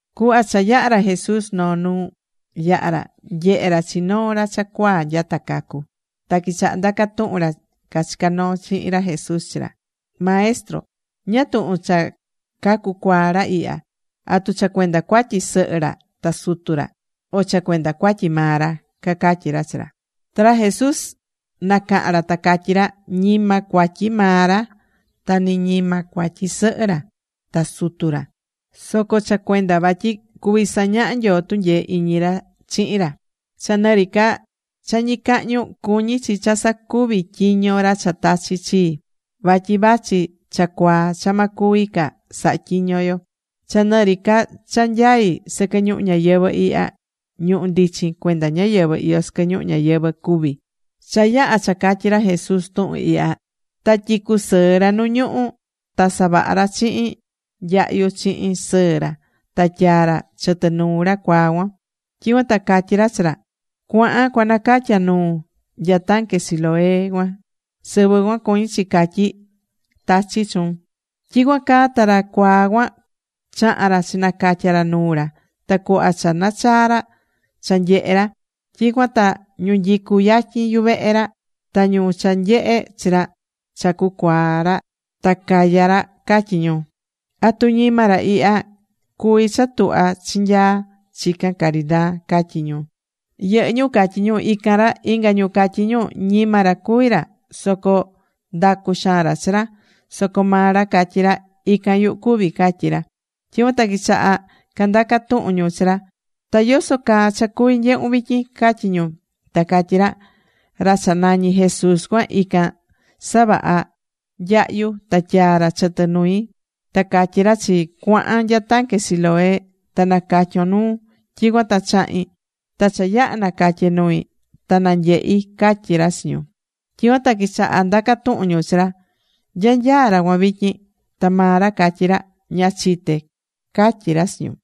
Cuhva cha yaha̱ ra Jesús noo nu yaha̱ ra, nyehe̱ ra chi noo ra cha cuaa nyata cacu. Ta quichahá ndaca tuhun ra cachicá noo chihin ra Jesús chi ra: ―Maestro, ¿ñáá tuhun cha cacu cuaa ra ihya? ¿Atu cha cuenda cuatyi sɨhɨ ra ta sutu ra, o cha cuenda cuatyi maa ra? ―cacatyí ra chi ra. Ta ra Jesús nacaha̱n ra ta catyí ra: ―Ñima cuatyi maa ra, ta ni ñima cuatyi sɨhɨ ra ta sutu ra. Soco cha cuenda vatyi cuví sañaha Nyoo tunyee iñi ra chihin ra. Cha nɨ ri ca cha ñicahñu, cuñí chi cha sacuvi tyiño ra cha tachi̱ chii. Vatyi vachi cha cuaa cha ma cuvi ca saha tyiño yo. Cha nɨ ri ca cha nyaí sɨquɨ ñuhu ñayɨvɨ̱ ihya, ñuhu̱ ndichin cuenda ñáyɨvɨ iyó sɨquɨ ñuhu ñayɨvɨ̱ cuví. Cha yaha̱ cha catyí ra Jesús tuhun ihya, ta tyicu̱ sɨɨ ra nu ñuhú. Ta savaha̱ ra chiin nyahyu chihin sɨɨ ra ta tyaa̱ ra chɨtɨ nuu ra cuaa cuan. Tyicuan ta catyí ra chi ra: ―Cua̱han cuanacatya nuun nya tanque Siloé cuan. ―Sɨvɨ cuan cuñí chi catyí: “Tachi̱ Chuun.” Tyicuan caa ta ra cuaa cuan chaha̱n ra chinacatya̱ ra nuu ra. Ta cuhva cha nachaa̱ ra, cha nyehe ra. Tyicuan ta ñu nyicú yatyin yuvehe ra, ta ñu cha nyehe̱ chi ra cha cucuaa̱ ra ta caya̱ ra, catyí ñu: ―¿Atu ñima ra ihya cuví cha tuhva chinyaa chican caridaa? ―catyí ñu. Yɨhɨ́ ñu catyí ñu: ―Ican ra. Inga ñu catyí ñu: ―Ñima ra cuví ra, soco ndacú xaan ra chi ra. Soco maa ra catyí ra: ―Ican yuhu cuví ―catyí ra. Tyicuan ta quichaha candaca tuhun ñu chi ra: ―¿Ta yoso caa cha cuví nyehun vityin? ―catyí ñu. Ta catyí ra: ―Ra cha nañí Jesús cuan, ican savaha̱ nyahyu ta tyaa̱ ra chɨtɨ nui ta catyí ra chii: “Cua̱han nya tanque Siloé ta nacatyon nuun.” Tyicuan ta chahi̱n. Ta cha yaha̱ nacatye nui ta nanyehi̱ ―catyí ra chi ñu. Tyicuan ta quichahá ndaca tuhun ñu chi ra: ―¿Nya nyaá ra cuan vityin? Ta maa ra catyí ra: ―Ña chité ―catyí ra chi ñu.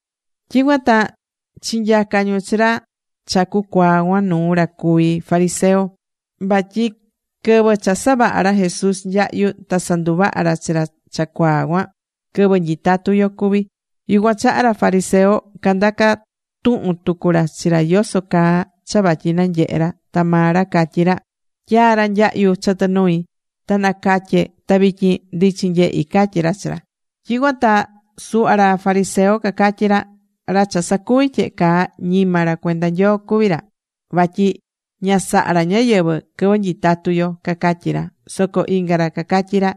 Tyicuan ta chinyaca̱ ñu chi ra cha cucuaa̱ cuan nuu ra cuví fariseo. Vatyi quɨvɨ cha savaha̱ ra Jesús nyahyu ta sanduvaha̱ ra chi ra cha cucuaa̱ cuan, quɨvɨ nyitatú yo cuvi̱. Yucuan chaha ra fariseo candaca̱ tuhun tucu ra chi ra yoso caa cha vatyi nanyehé ra. Ta maa ra catyí ra: ―Tyaa̱ ra nyahyu chɨtɨ nui, ta nacatye̱ ta vityin ndichin nyehí ―catyí ra chi ra. Tyicuan ta suhva ra fariseo cacatyí ra: ―Ra cha sacuvi̱ tyehe caa ñima ra cuenda Nyoo cuví ra, vatyi ña sahá ra ñáyɨvɨ quɨvɨ nyitatú yo ―cacatyí ra. Soco inga ra cacatyí ra: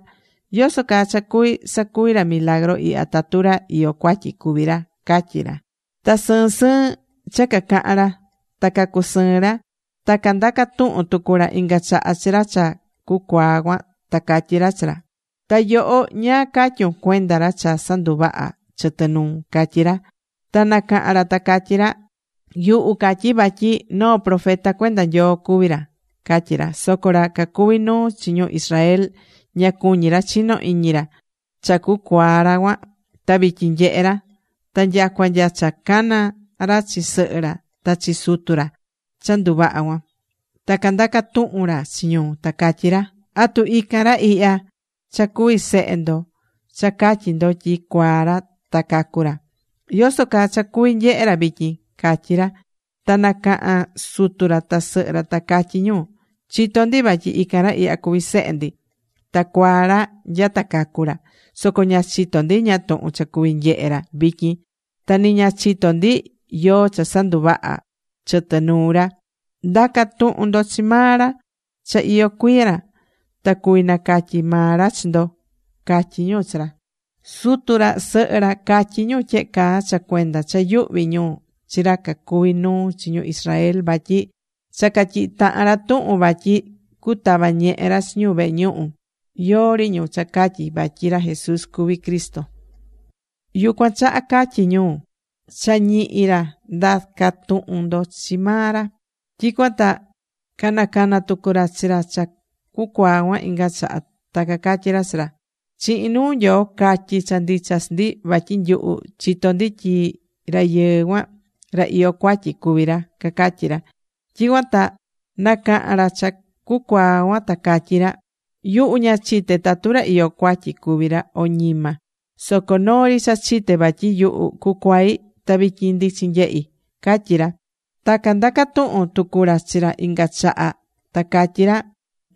―¿Yoso caa cha cuví sacuvi ra milagru ihya tatu ra iyó cuatyi cuví ra? ―catyí ra. Ta sɨɨn sɨɨn cha cacahan ra. Ta cacusɨɨ̱n ra. Ta candaca̱ tuhun tucu ra inga chaha chi ra cha cucuaa̱ cuan, ta catyí ra chi ra: ―¿Ta yoho, ñáá catyún cuenda ra cha sanduvaha̱ chɨtɨ nuun? ―catyí ra. Ta nacaha̱n ra ta catyí ra: ―Yuhu catyí vatyi noo profeta cuenda Nyoo cuví ra ―catyí ra. Soco ra cacuví nuu chi ñu Israel ña cuñí ra chino iñi ra cha cucuaa̱ ra cuan ta vityin nyehé ra. Ta nyacua nya cha cacana̱ ra chi sɨhɨ ra ta chi sutu ra cha nduvaha̱ cuan. Ta candaca̱ tuhun ra chi ñu, ta catyí ra: ―¿Atu ican ra ihya cha cuví sehe ndo cha catyí ndo tyi cuaá ra ta cacu̱ ra? ¿Yoso caa cha cuví nyehe ra vityin? ―catyí ra. Ta nacaha̱n sutu ra ta sɨhɨ ra ta catyí ñu: ―Chitó ndi vatyi ican ra ihya cuví sehe ndi. Ta cuaá ra nyata cacu̱ ra. Soco ña chitó ndi ñáá tuhun cha cuví nyehe ra vityin. Ta ni ña chitó ndi yóó cha sanduvaha̱ chɨtɨ nuu ra. Nda̱ca tuhun ndo chi maa ra. Cha iyó cuiya ra. Ta cuví nacatyi maa ra chi ndo ―catyí ñu chi ra. Sutu ra sɨhɨ ra catyí ñu tyehe caa cha cuenda cha yuhví ñu chi ra cacuví nuu chi ñu Israel, vatyi cha catyihi̱ tahan ra tuhun vatyi cutava ñehe ra chi ñu vehe ñuhu, yóó ri ñu cha catyí vatyi ra Jesús cuví Cristo. Yucuan chaha catyi̱ ñu: “Cha ñihi ra. Nda̱ca tuhun ndo chi maa ra.” Tyicuan ta canacana̱ tucu ra chi ra cha cucuaa̱ cuan inga chaha. Ta cacatyí ra chi ra: ―Chihin nuu Nyoo ca̱tyi cha ndicha chi ndi. Vatyi nyuhu chitó ndi tyi rayɨɨ cuan, ra iyó cuatyi cuví ra ―cacatyí ra. Tyicuan ta nacaha̱n ra cha cucuaa̱ cuan ta catyí ra: ―Yuhu ña chité tatu ra iyó cuatyi cuví ra, o ñima. Soco noo ri cha chité vatyi yuhu cucuai̱, ta vityin ndichin nyehí ―catyí ra. Ta candaca tuhu̱n tucu ra chi ra inga chaha ta catyí ra: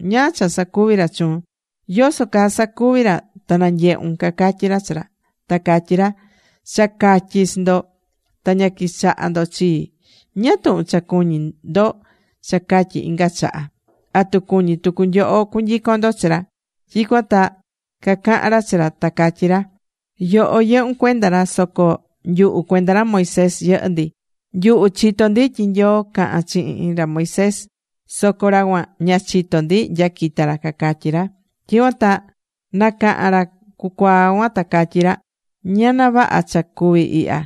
―¿Ñáá cha sacuví ra chuun? ¿Yoso caa sacuvi̱ ra ta nanyehún? ―cacatyí ra chi ra. Ta catyí ra: ―Cha catyi̱ chi ndo, ta ña quichahá ndo chii. ¿Ñáá tuhun cha cuñí ndo cha catyi inga chaha? ¿Atu cuñí tucu nyoho cunyicon ndo chi ra? Tyicuan ta cacaha̱n ra chi ra, ta catyí ra: ―Yoho yɨhún cuenda ra, soco nyuhu cuenda ra Moisés yɨhɨ́ ndi. Nyuhu chitó ndi tyi Nyoo caha̱n chihin ra Moisés. Soco ra cuan, ña chitó ndi nya quita̱ ra ―cacatyí ra. Tyicuan ta nacaha̱n ra cucuaa̱ cuan ta catyí ra: ―¡Ñana vaha cha cuví ihya!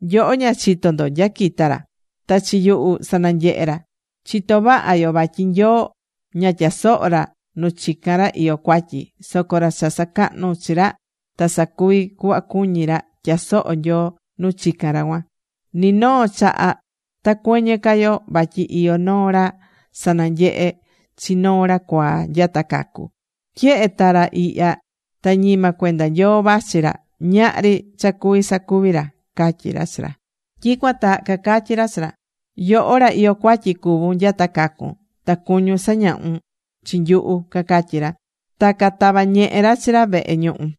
Nyoho ña chitó ndo nya quita̱ ra, ta chi yuhu sananyehe̱ ra. Chitó vaha yo vatyi Nyoo ña tyasohó ra nu chicán ra iyó cuatyi. Soco ra cha sacahnú chi ra ta sacuví cuhva cuñí ra, tyasohó Nyoo nu chicán ra cuan. Ni noo chaha ta cuɨñɨ ca yo vatyi iyó noo ra sananyehe̱ chi noo ra cuaá nyata cacu̱. Tyehe ta ra ihya ta ñima cuenda Nyoo vachí ra, ñahri cha cuví sacuvi ra ―catyí ra chi ra. Tyicuan ta cacatyí ra chi ra: ―Yoho ra iyó cuatyi cuvún nyata cacu̱n. ¿Ta cuñún sañahu̱n chi nyuhu? ―cacatyí ra. Ta catava̱ ñehe ra chi ra vehe ñuhu.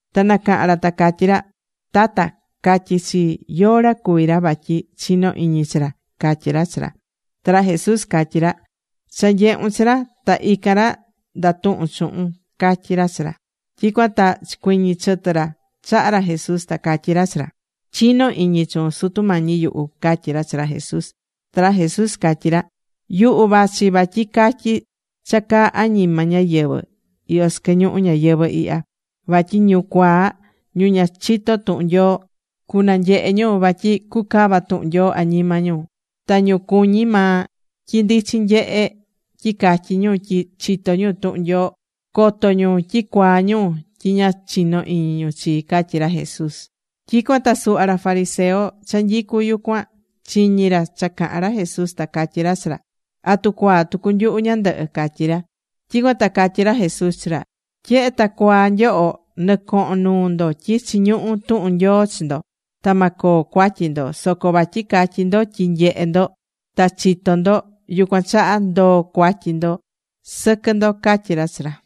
Ta nacaha̱n ra ta catyí ra: ―Tata, ca̱tyi chii, yóó ra cuví ra vatyi chino iñi chi ra ―catyí ra chi ra. Ta ra Jesús catyí ra: ―Cha nyehu̱n chi ra. Ta ican ra ndatuhún chuhun ―catyí ra chi ra. Tyicuan ta chicuiñi̱ chɨtɨ ra chaha ra Jesús ta catyí ra chi ra: ―Chinó iñi chuun, Sutu Mañi yuhu ―catyí ra chi ra Jesús. Ta ra Jesús catyí ra: ―Yuhu vachí vatyi catyi cha caá añima ñáyɨvɨ iyó sɨquɨ ñuhu ñayɨvɨ̱ ihya. Vatyi ñu cuaa, ñu ña chitó tuhun Nyoo cunanyehe ñu vatyi cucava tuhun Nyoo añima ñu. Ta ñu cuñí maa tyi ndichin nyehe tyi catyí ñu tyi chitó ñu tuhun Nyoo, coto ñu tyi cuaa ñu tyi ña chinó iñi ñu chii ―catyí ra Jesús. Tyicuan ta suhva ra cuví fariseo cha nyicú yucuan chiñi̱ ra cha caha̱n ra Jesús, ta catyí ra chi ra: ―¿Atu cuaa tucu nyuhu ñandɨhɨ? ―catyí ra. Tyicuan ta catyí ra Jesús chi ra: ―Tyehe ta cuaa nyoho, nɨcohón nuu ndo tyi chiñuhú tuhun Nyoo chi ndo, ta ma coo cuatyi ndo. Soco vatyi catyí ndo tyi nyehé ndo ta chitó ndo, yucuan chaha ndoó cuatyi sɨquɨ ndo ―catyí ra chi ra.